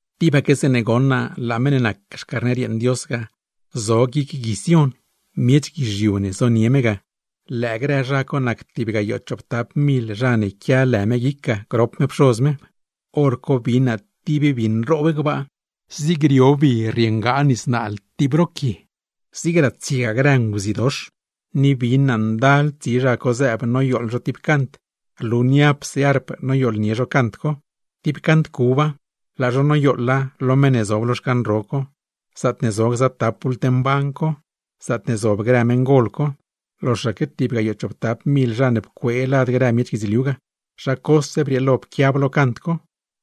Tibaque zeeṉe goṉ naa laa meṉ ne nac Xcarner yeeṉ Dios ga zo guic Gui Sión, miech guizhiu ne zonie me ga; lëë grë zha co nac tib gayoo chooptap mil zha ne quia lë me guic ga, grop me Pxoz me. Horco bin naa tib bi nroob gbaa, zig rio bi rrieengaa tib nis naal tib ro quie, zig ratsiegaa grë nguzidox, ni bin naa ndal tsi zha co zëëb noyooḻ zho tib cant, rlu niapse arp noyooḻnie zho cant co. Tib cant cuba, laa zho noyooḻa lo meṉ ne zob lo xcan ro co, zaatne zo gza tap bult mban co, zaatne zob grë meṉgol co. Loxaque tib gayoo chooptap mil zha ne pcuee lad grë miech guidzliu ga, zha cose brieelo pquiab lo cant co.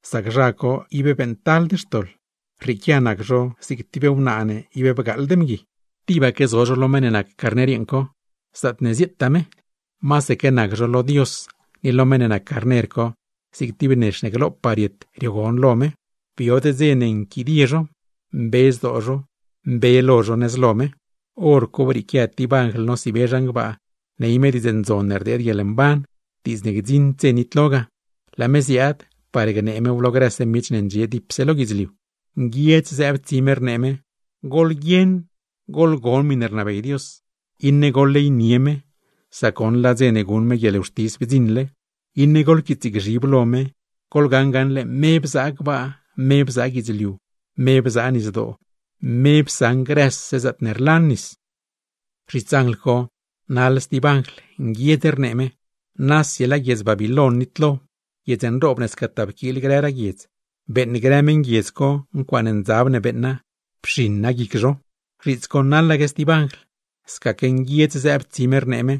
Sac zha co ib beeṉctald xtoḻ, rrieequia nac zho zig tib wnaa ne bgaaḻd mgui; tibaque zo zho lo Meṉ ne nac Carner yeeṉ co, zaatne zieetaa me. Masaque nac zho lo Dios, ni lo meṉ ne nac Carner co, zig tib nex ne glopaa riet riogon lo me. Biod dze ne nquidie zho, mbe zdoo zho, mbe lo zho nëz lo me. Horco brieequia tib anjl nosiibe zhan gbaa, ney me Diidz Ndzon ne rdeed guieḻmban, diidz ne gdziṉd dze nitlo ga; laa me ziaad par gnee mew lo grëse miech ne ndxie dipse lo guidzliu. Nguiedz zëëb tsi me, rnee me: ―¡Goḻguieṉ goḻgon miṉe rnabey Dios, iṉe goḻleynie me, sac goṉ laa dze ne guṉ me guieḻwxtis bdziṉle! Iṉe goḻquiitsgzhib lo me, goḻgaṉ gaṉle me bzaa gbaa, me bzaa guidzliu, me bzaa nisdoo, me psaṉ grëse zaatne rlan nis. Zhits anjl co naḻ stib anjl, nguiedz rnee me: ―¡Nasi laa guiedz Babiloin nitlo! ¡Guiedz nroob ne scataa pquiil grëraa guiedz, beeṉ grë meṉguiedz co ncuaaṉ ndzab ne beeṉa, pxiṉa guic zho! Zhiits co naḻaque stib anjl, scaque nguiedz zëëb tsi me, rnee me: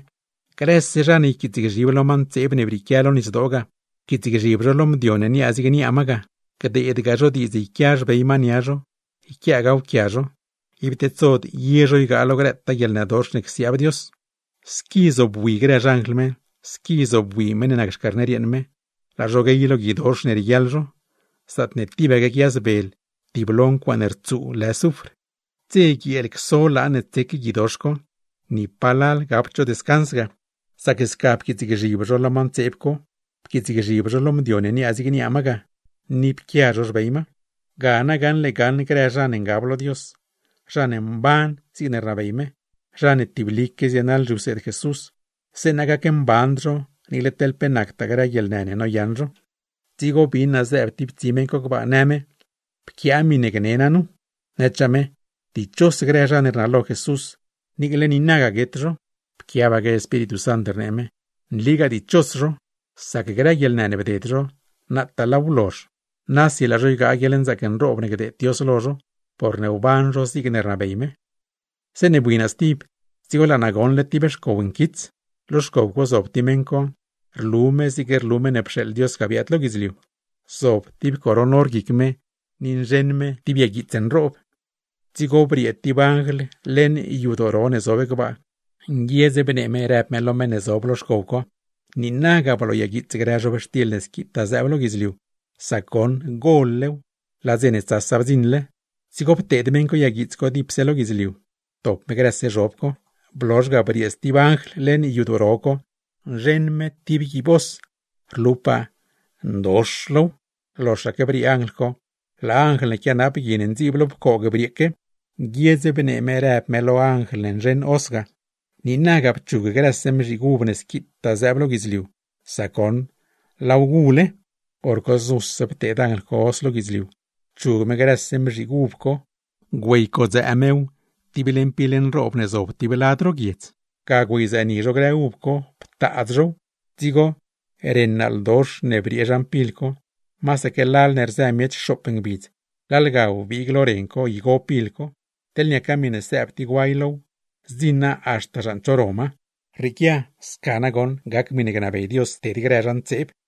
―¡Grëse zha ne yquiitsgzhib lo ma ntseeb ne brieequia lo nisdoo ga, yquiitsgzhib zho lo mdio ne niaa zig niaa ma ga, gdeedgaa zho diidz yquia xbey ma nia zho, yquiaagaaw quia zho, ib tedsod ye zho ygaa lo grëtaa guieḻnëdox ne csiaab Dios! Squi zobwi grë xanjl me, squi zobwi Meṉ ne nac Xcarner yeeṉ me, laa zho guey lo guidox ne rieguiaḻ zho, zaatne tibaque quiayazbel tiblo ncuaaṉe rtsuu lë zufr. Dze guieel cso laan ne tsec guidox co, ni palal gapd zho descans ga; sac sca pquiitsgzhib zho lo ma ntseeb co, pquiitsgzhib zho lo mdio ne niaa zig niaa ma ga, ni pquia zho xbey ma. ¡Ga nagaṉle gaṉ grë zha ne ngab lo Dios, zha ne mban zigne rnabey me, zha ne tiblique zienaḻ zhiwseed Jesús, zeeṉa gacmband zho niicle teḻ pe nactaa grë guieḻnë ne noyaṉ zho! Dzigo bin naa zëëb tib tsi meṉ co gbaa, në me: ―Pquiaa miṉe gni naa nu. Nëchaa me: ―Dichos grëse zha ne rnalo Jesús, niicle niinaga guet zho. Pquiabaque Espíritu Sant, rnee me: ―Nligaa dichos zho, sac grë guieḻnë ne bded zho, nataa laaw blozh; nasi laa zho ygaa guieḻnzaac nroob ne gdeed Dios lo zho, porne wban zho zigne rnabey me. Zeeṉe bui naa stib, dzigo laa naa goṉle tib xcow nquits; lo xcow co zob tib meṉ co, rlu me zig rlu Meṉ ne pxeeḻ Dios ga biaad lo guidzliu. Zob tib coron or guic me, ni nzheṉ me tib yaguiits nroob. Dzigo briee tib anjl leṉ yadoo ro ne zob gbaa, nguiedz bnee me rëb me lo meṉ ne zob lo xcow co: ―¡Niinaga blooyaguiits grë zhob ne squitaa zëëb lo guidzliu! ¡Sac goṉ gol-lew, laa dze ne tsasa bdziṉle! Dzigo pteed meṉ co yaguiits dipse lo guidzliu, ptop me grëse zhob co. Blozh ga, briee stib anjl leṉ yadoo ro co nzheṉ me tib guiib hoz, rlupaa per nli ndox low. Loxaque briee anjl co, laa anjl ne quianap gui ne ndziib lo pcoog brieeque; nguiedz bnee me rëb me lo anjl ne nzheṉ hoz ga: ―¡Niinaga pchug grëse mzhiig uv ne squitaa zëëb lo guidzliu, sac goṉ laaw gule! Horco znuse pteed anjl co hoz lo guidzliu, pchug me grëse mzhiig uv co, güeycodzëë mew tib leṉ pil nroob ne zob tib lad ro guiedz. Ga güeyzëëni zho grë uv co, ptaadz zhow; dzigo ren naaldox ne briee zhan pil co, masaque lal ne rzëni miech xoop ngbidz, lal ga wbiig lo ren co igo pil co; teḻ niaca miṉe sëëb tib guay low, zdziṉa haxta zhan cho ro ma. Rrieequia sca nagoṉ gac miṉe gnabey Dios ted grë zha ntseeb.